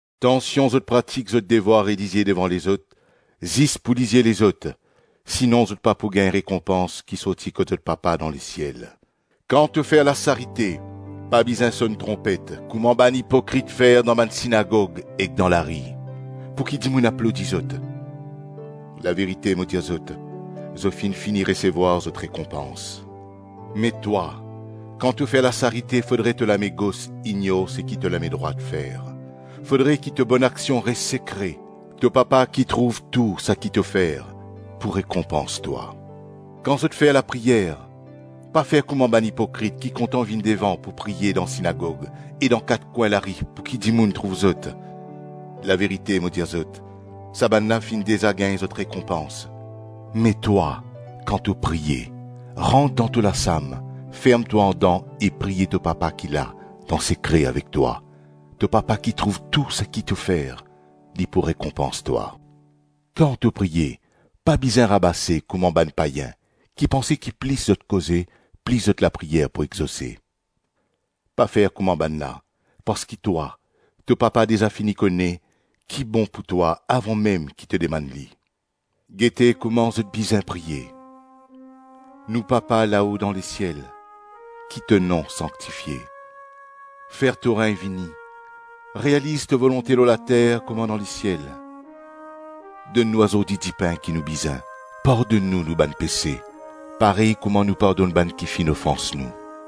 “Tansion zot pratik zot devwar relizie devan lezot, zis pou lizie lezot; sinon zot pa pou gagn rekonpans ki sorti kot zot Papa dan lesiel. Kan to fer lasarite, pa bizin sonn tronpet kouma bann ipokrit fer dan bann sinagog ek dan lari, pouki dimoun aplodi zot. Laverite, mo dir zot, zot finn fini resevwar zot rekonpans. Me twa, kan to fer lasarite fodre to lame gos ignor seki to lame drwat fer, fodre ki to bonaksion res sekre; to Papa ki trouv tou saki to fer pou rekonpans twa. Kan zot fer lapriyer, pa fer kouma bann ipokrit ki kontan vinn devan pou priye dan sinagog e dan kat kwin lari pouki dimoun trouv zot. Laverite mo dir zot, sa bann la finn deza gagn zot rekonpans. Me twa, kan to priye, rant dan to lasam, ferm twa andan e priye to Papa ki la dan sekre avek twa; to Papa ki trouv tou saki to fer, li pou rekonpans twa. Kan to priye pa bizin rabase kouma bann payin, ki panse ki plis zot koze, plis zot lapriyer pou exose. Pa fer kouma bannla, parski twa, to Papa deza fini kone ki bon pou twa avan mem ki to dimann li. Gete kouma zot bizin priye: ‘Nou Papa lao dan lesiel, ki to nom sanktifie. Fer to regn vini realiz to volonte lor later kouma dan lesiel. Donn nou azordi dipin ki nou bizin. Pardonn nou nou bann pese, parey kouma nou pardonn bann ki finn ofans nou.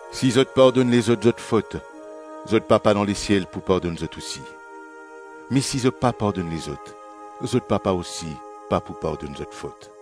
Si zot pardonn lezot zot fot, zot Papa dan lesiel pou pardonn zot osi, me si zot pa pardonn lezot, zot Papa osi pa pou pardonn zot fot.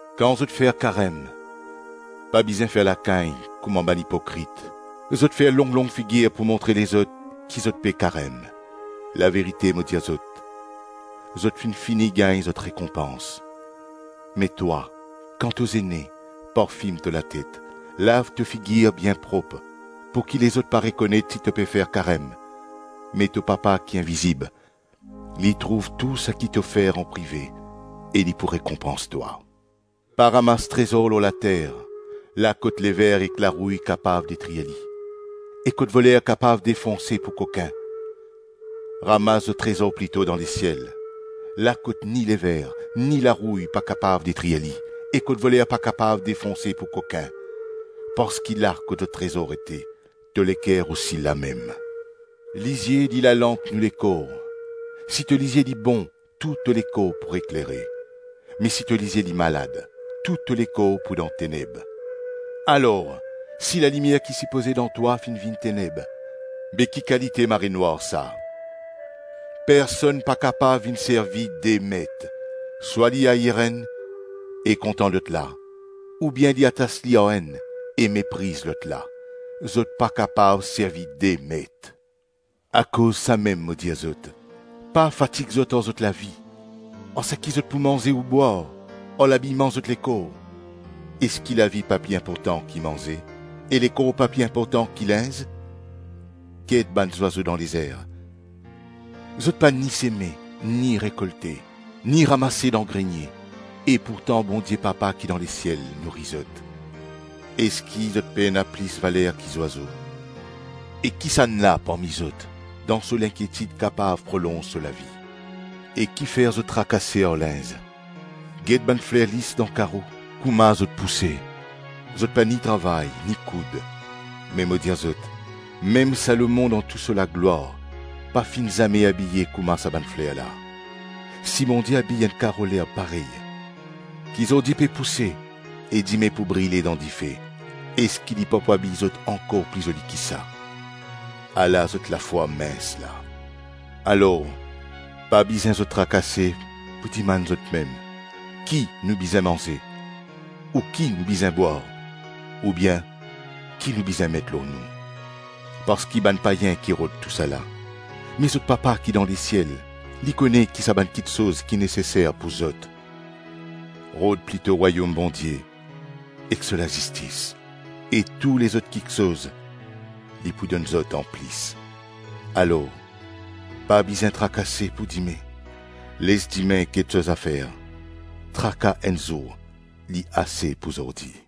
Kan zot fer karem, pa bizin fer lakagn, kouma bann ipokrit, zot fer long-long figir pou montre lezot ki zot pe karem. Laverite mo dir zot, zot finn fini gagn zot rekonpans; me twa, kan to zene, parfim to latet, lav to figir bien prop, pouki lezot pa rekonet si to pe fer karem, me to Papa ki invizib, li trouv tou saki to fer anprive e li pou rekonpans twa. Pa ramas trezor lor later, la kot lever ek larouy kapav detrir li, e kot voler kapav defonse pou kokin. Ramas zot trezor plito dan lesiel, la kot ni lever, ni larouy pa kapav detrir li, e kot voler pa kapav defonse pou kokin, parski la kot to trezor ete, to leker osi li lamem. Lizie, li lalanp nou lekor. Si to lizie li bon, tou to lekor pou eklere, me si to lizie li malad, tou to lekor pou dan teneb. Alor, si lalimier ki sipoze dan twa finn vinn teneb, be ki kalite marenwar sa! Personn pa kapav vinn servi de met. Swa li air enn e kontan lot la, oubien li atas li ar enn e mepriz lot la. Zot pa kapav servi de met. Akoz samem mo dir zot: pa fatig zot ar zot lavi, ar seki zot pou manze ou bwar, ar labiyman zot lekor. Eski lavi pa pli inportan ki manze, e lekor pa pli inportan ki linz? Get bann zwazo dan lezer, zot pa ni seme, ni rekolte, ni ramase dan grenie, e pourtan Bondie Papa ki dan lesiel nouri zot. Eski zot pena plis valer ki zwazo? E kisannla parmi zot, dan so linkietid, kapav prolonz so lavi. E kifer zot trakase ar linz? Get bann fler lis dan karo, kouma zot pouse. Zot pa ni travay ni koud, me mo dir zot, mem Salomon dan tou sa laglwar pa finn zame abiye kouma sa bann fler la. Si Bondie abiy enn karo lerb parey, ki zordi pe pouse e dime pou brile dan dife, eski li pa pou abiy zot ankor pli zoli ki sa? Ala zot lafwa mins la! Alor, pa bizin zot trakase pou dimann zotmem, ‘Ki nou bizin manze?’ ou ‘Ki nou bizin bwar?’ oubien ‘Ki nou bizin met lor nou?’ Parski bann payin ki rod tousala; me zot Papa ki dan lesiel, li kone ki sa bann kiksoz ki neseser pou zot. Rod plito Rwayom Bondie ek so lazistis, e tou lezot kiksoz li pou donn zot anplis. Alor, pa bizin trakase pou dime, les dime get so zafer. Traka enn zour li ase pou zordi.”